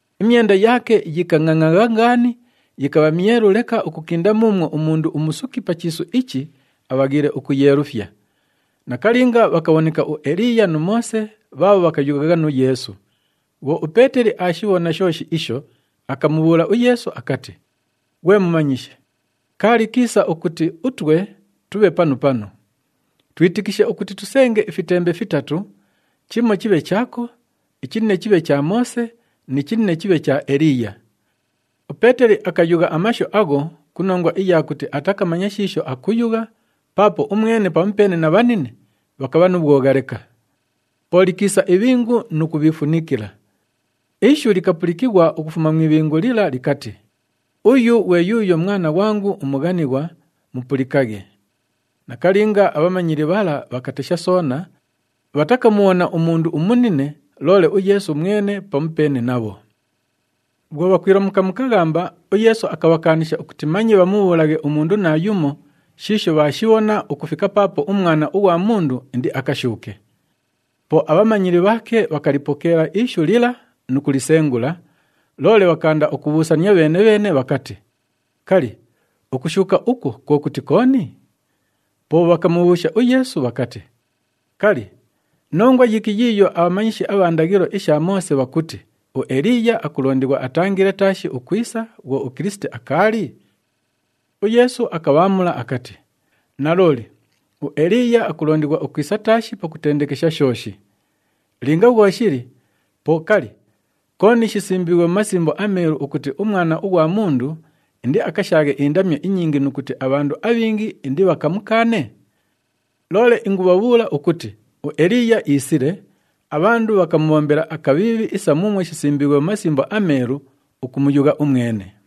Imyenda yaake yikangʼangʼagha ngaani, yikabha myelu leka ukukinda muumwo umundu umusuki pa chiisu ichi abhaghiile ukuyeelufya. Nakalinga bhakabhoneka uEliiya nu Moose bhaabho bhakayughagha nu Yeesu. Bhwo uPeeteli aashibhona shooshi isho, akamubhuula uYeesu akati, “Ghwe Mumanyishi, kaali kiisa ukuti utwe tubhe panu panu. Twitikishe ukuti tusenge ifitembe fitatu, chimo chibhe chaako, ichinine chibhe cha Moose ni chinine chibhe cha Eliiya.” UPeeteli akayugha amashu agho ku nongwa iya kuti atakamanya shiisho akuyugha paapo umwene pamupeene na bhanine bhakabha nu bhwogha leka. Po likiisa ibhingu nu kubhiifunikila. Ishu likapulikighwa ukufuma mu ibhingu lila likati, “Uyu ghwe yuuyo Mwana ghwangu umughanighwa, mupulikaghe!” Nakalinga, abhamanyili bhala bhakatesha soona, bhatakamubhona umundu umunine, loole uYeesu mwene pamupeene nabho. Bhwo bhakwilomuka mu kaghamba, uYeesu akabhakaanisha ukuti manye bhamubhuulaghe umundu naayumo shiisho bhaashibhona ukufika paapo uMwana ughwa Mundu indiakashuuke. Po abhamanyili bhaake bhakalipokeela ishu lila nu kulisengula, loole bhakaanda ukubhuusania bheene-bheene bhakati, “Kali, ukushuuka ukwo kwo kuti kooni?” Po bhakamubhuusha uYeesu bhakati, “Kali, nongwa yiki yiiyo abhamanyishi abha ndaghilo isha Moose bhakuti uEliiya akulondighwa atangile taashi ukwisa bhwo uKilisiti akaali?” UYeesu akabhaamula akati, “Nalooli, uEliiya akulondighwa ukwisa taashi pakutendekesha shooshi. Linga bhwo shili, po kali, kooni shisimbiighwe mu Masimbo aMeelu ukuti uMwana ughwa Mundu indiakashaaghe indamyo inyingi nu kuti abhandu abhingi indibhakamukaane? Loole ingubhabhuula ukuti uEliiya iisile, abhandu bhakamubhombela akabhiibhi isa muumwo shisimbiighwe mu Masimbo aMeelu ukumuyugha umwene.”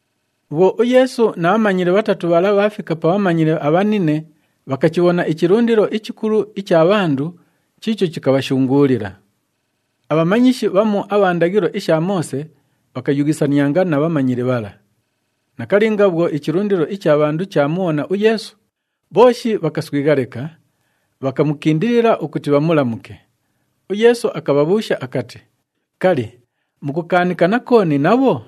Bhwo uYeesu na bhamanyili bhatatu bhala bhaafika pa bhamanyili abhanine, bhakachibhona ichilundilo ichikulu icha bhandu chiicho chikabhashunguulila. Abhamanyishi bhamu abha ndaghilo isha Moose bhakayughisanianga na bhamanyili bhala. Nakalinga bhwo ichilundilo icha bhandu chaamubhona uYeesu, bhooshi bhakaswigha leka, bhakamukindilila ukuti bhamulamuke. UYeesu akabhabhuusha akati, “Kali, mukukaanikana kooni nabho?”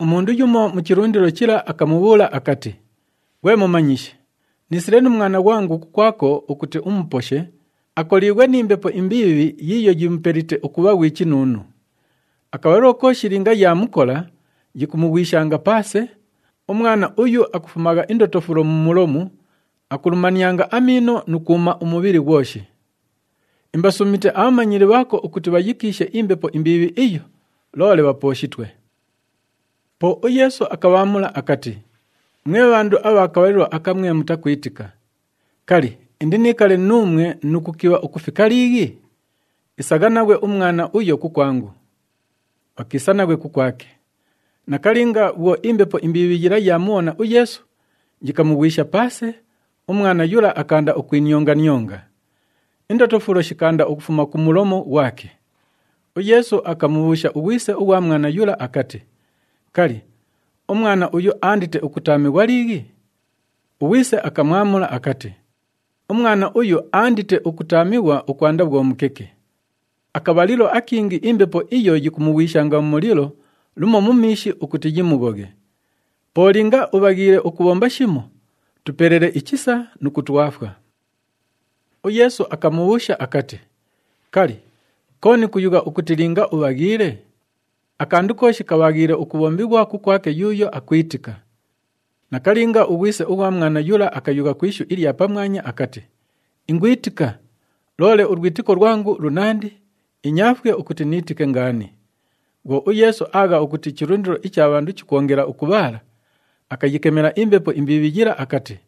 Umundu yumo mu chilundilo chila akamubhuula akati, “Ghwe Mumanyishi, niisile nu mwana ghwangu kukwako ukuti umuposhe, akoliighwe ni mbepo imbiibhi yiiyo yimupelite ukubha ghwi chinuunu. Akabhalilo kooshi linga yaamukola, yikumughwishanga paase, umwana uyu akufumagha indotofulo mu mulomu, akulumanianga amiino nu kwuma umubhili ghwoshi. Imbasuumite abhamanyili bhaako ukuti bhayikiishe imbepo imbiibhi iyo, loole bhapooshitwe.” Po uYeesu akabhaamula akati, “Mwe bhandu abha kabhalilo aka mwe mutakwitika, kali, indiniikale nuumwe nu kukibha ukufika liighi? Isagha naghwe umwana uyo kukwangu.” Bhakiisa naghwe kukwake. Nakalinga bhwo imbepo imbiibhi yila yaamubhona uYeesu, yikamughwisha paase, umwana yula akaanda ukwinionga-nionga. Indotofulo shikaanda ukufuma ku mulomu ghwake. UYeesu akamubhuusha ughwise ughwa mwana yula akati, “Kali, umwana uyu aandite ukutaamighwa liighi?” Ughwise akamwamula akati, “Umwana uyu, aandite ukutaamighwa ukwanda bhwo mukeke. Akabhalilo akingi imbepo iyo yikumughwishanga mu mulilo lumo mu miishi ukuti yimughoghe. Po linga ubhaghiile ukubhomba shimo, tupelele ichisa nu kutwafwa.” UYeesu akamubhuusha akati, “Kali, kooni kuyugha ukuti, ‘linga ubhaghiile’? Akandu kooshi kabhaghiile ukubhombighwa kukwake yuuyo akwitika.” Nakalinga, ughwise ughwa mwana yula akayugha ku ishu ilya pamwanya akati, “Ingwitika! Loole ulwitiko lwangu lunandi, inyaafwe ukuti niitike ngaani.” Bhwo uYeesu aagha ukuti ichilundilo icha bhandu chikwongela ukubhaala, akayikemela imbepo imbiibhi yila akati,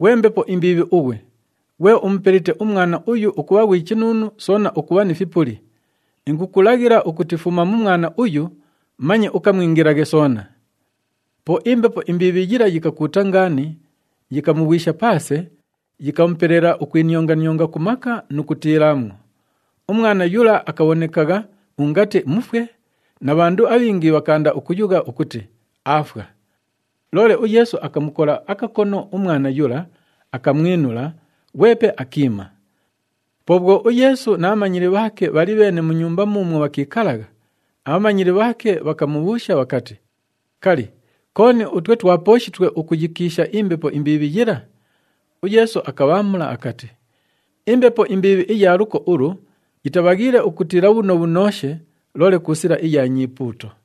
“Ghwe mbepo imbiibhi ughwe, ghwe umupelite umwana uyu ukubha ghwi chinuunu soona ukubha ni fipuli, ingukulaghila ukuti fuma mu mwana uyu, manye ukamwingilaghe soona!” Po imbepo imbiibhi yila yikakuuta ngaani, yikamughwisha paase, yikamupelela ukwinionga-nionga ku maka nu kutiilaamwo. Umwana yula akabhonekagha ungati mufwe na bhandu abhingi bhakaanda ukuyugha ukuti, “Aafwa!” Loole uYeesu akamukola akakono umwana yula, akamwinula, ghwepe akiima. Po bhwo uYeesu na bhamanyili bhaake bhali bheene mu nyumba muumwo bhakiikalagha, abhamanyili bhaake bhakamubhuusha bhakati, “Kali, kooni utwe twapooshitwe ukuyikiisha imbepo imbiibhi yila?” UYeesu akabhaamula akati, “Imbepo imbiibhi iya luko ulu yitabhaghiile ukutiila bhunobhunooshe, loole ku sila iya nyipuuto.”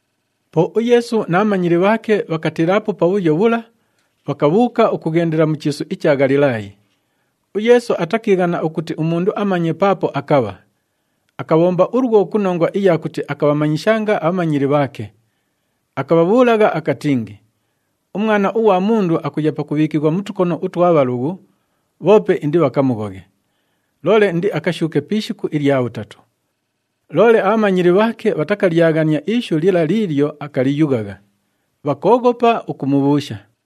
Po uYeesu na bhamanyili bhaake bhakatiilaapo pabhuyo bhula, bhakabhuuka ukughendela mu chiisu icha Ghalilaayi. UYeesu atakiighana ukuti umundu amanye paapo akabha. Akabhomba ulwo ku nongwa iya kuti akabhamanyishanga abhamanyili bhaake. Akabhabhuulagha akatingi, “UMwana ughwa Mundu akuya pakubhiikighwa mu tukono utwa bhalughu, bhoope indibhakamughoghe. Loole indiakashuuke pi ishiku ilya bhutatu.” Loole abhamanyili bhaake bhatakalyaghania ishu lila liilyo akaliyughagha, bhakooghopa ukumubhuusha.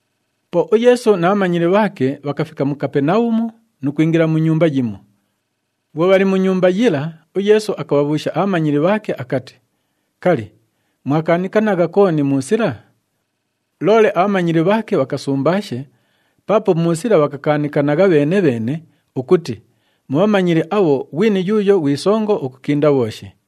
Po uYeesu na bhamanyili bhaake bhakafika mu Kapenabhumu nu kwingila mu nyumba yimo. Bhwo bhali mu nyumba yila, uYeesu akabhabhuusha abhamanyili bhaake akati, “Kali, mwakaanikanagha kooni mu sila?” Loole abhamanyili bhaake bhakasumbaashe paapo mu sila bhakakaanikanagha bheene-bheene ukuti mu bhamanyili abho ghwini yuuyo ghwi songo ukukinda bhooshi.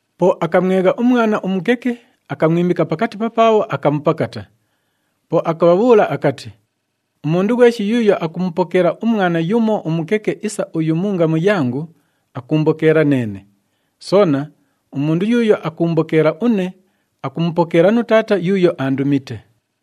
Po akamwegha umwana umukeke, akamwimika pakati papaabho, akamupakata. Po akabhabhuula akati, “Umundu ghweshi yuuyo akumupokeela umwana yumo umukeke isa uyu mu ngamu yangu, akuumbokeela neene. Soona, umundu yuuyo akuumbokeela une, akumupokeela nu Taata yuuyo aandumite.”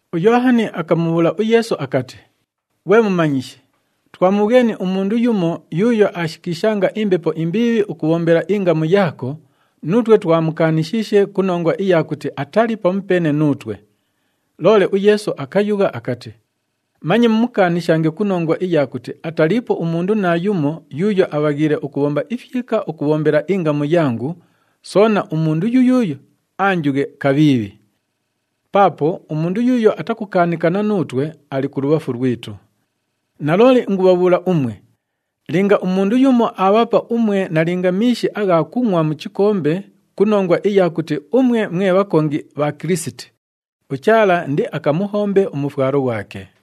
UYoohani akamubhuula uYeesu akati, “Ghwe Mumanyishi, twamubhweni umundu yumo yuuyo aashikiishanga imbepo imbiibhi ukubhombela ingamu yaako, nuutwe twamukaanishiishe ku nongwa iya kuti atali pamupeene nuutwe.” Loole uYeesu akayugha akati, “Manye mumukaanishange ku nongwa iya kuti ataliipo umundu naayumo yuuyo abhaghiile ukubhomba ifyika ukubhombela ingamu yangu, soona umundu yuyuuyo anjughe kabhiibhi. Paapo umundu yuuyo atakukaanikana nuutwe, ali kulubhafu lwitu. Nalooli ingubhabhuula umwe, linga umundu yumo aabhapa umwe nalinga miishi agha kungʼwa mu chikombe ku nongwa iya kuti umwe mwe bhakongi bha Kilisiti, uChaala indiakamuhombe umufwalo ghwake.”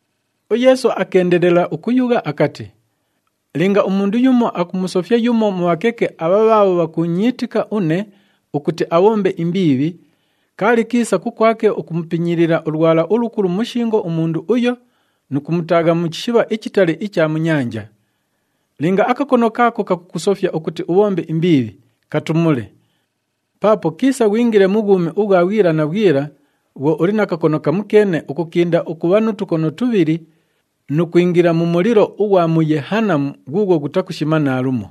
UYeesu akeendelela ukuyugha akati, “Linga umundu yumo akumusofya yumo mu bhakeke abha bhaabho bhakuunyiitika une ukuti abhombe imbiibhi, kaali kiisa kukwake ukumupinyiilila ulwala ulukulu mu shingo umundu uyo nu kumutaagha mu chishibha ichitali icha mu nyanja. Linga akakono kaako kakukusofya ukuti ubhombe imbiibhi, katumule! Paapo kiisa ghwingile mu bhwumi ubhwa bhwila na bhwila bhwo uli na kakono kamukeene ukukinda ukubha nu tukono tubhili nu kwingila mu mulilo ughwa mu Yehanamu ghuughwo ghutakushima naalumo. [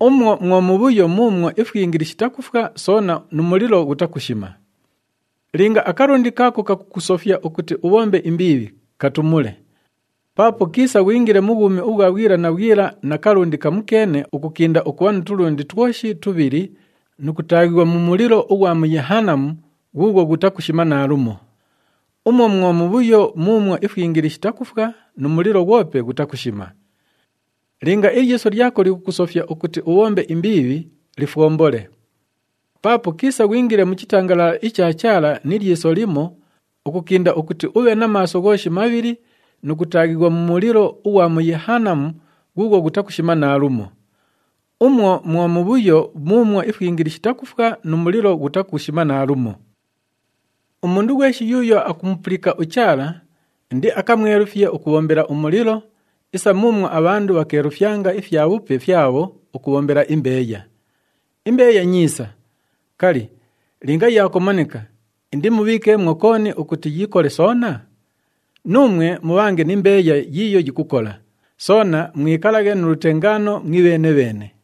Umwo mwo mubhuyo muumwo ifwingili shitakufwa, soona nu mulilo ghutakushima.] Linga akalundi kaako kakukusofya ukuti ubhombe imbiibhi, katumule! Paapo kiisa ghwingile mu bhwumi ubhwa bhwila na bhwila na kalundi kamukeene ukukinda ukubha nu tulundi twoshi tubhili nu kutaaghighwa mu mulilo ughwa mu Yehanamu ghuughwo ghutakushima naalumo. [ Umwo mwo mubhuyo muumwo ifwingili shitakufwa, nu mulilo ghwope ghutakushima.] Linga ilyiso lyako likukusofya ukuti ubhombe imbiibhi, lifwombole. Paapo kiisa ghwingile mu chitangalala icha Chaala ni lyiso limo ukukinda ukuti ubhe na maaso ghooshi mabhili nu kutaaghighwa mu mulilo ughwa mu Yehanamu ghuughwo ghutakushima naalumo. Umwo mwo mubhuyo muumwo ifwingili shitakufwa nu mulilo ghutakushima naalumo. “Umundu ghweshi yuuyo akumupulika uChaala, indiakamwelufye ukubhombela umulilo isa muumwo abhandu bhakeelufyanga ifyabhupe fyabho ukubhombela imbeeya. Imbeeya nyiisa. Kali, linga yaakomanika, indimubhiikeemwo kooni ukuti yikole soona? Nuumwe mubhange ni mbeeya yiiyo yikukola, soona mwikalaghe nu lutengaano mwibheene-bheene.”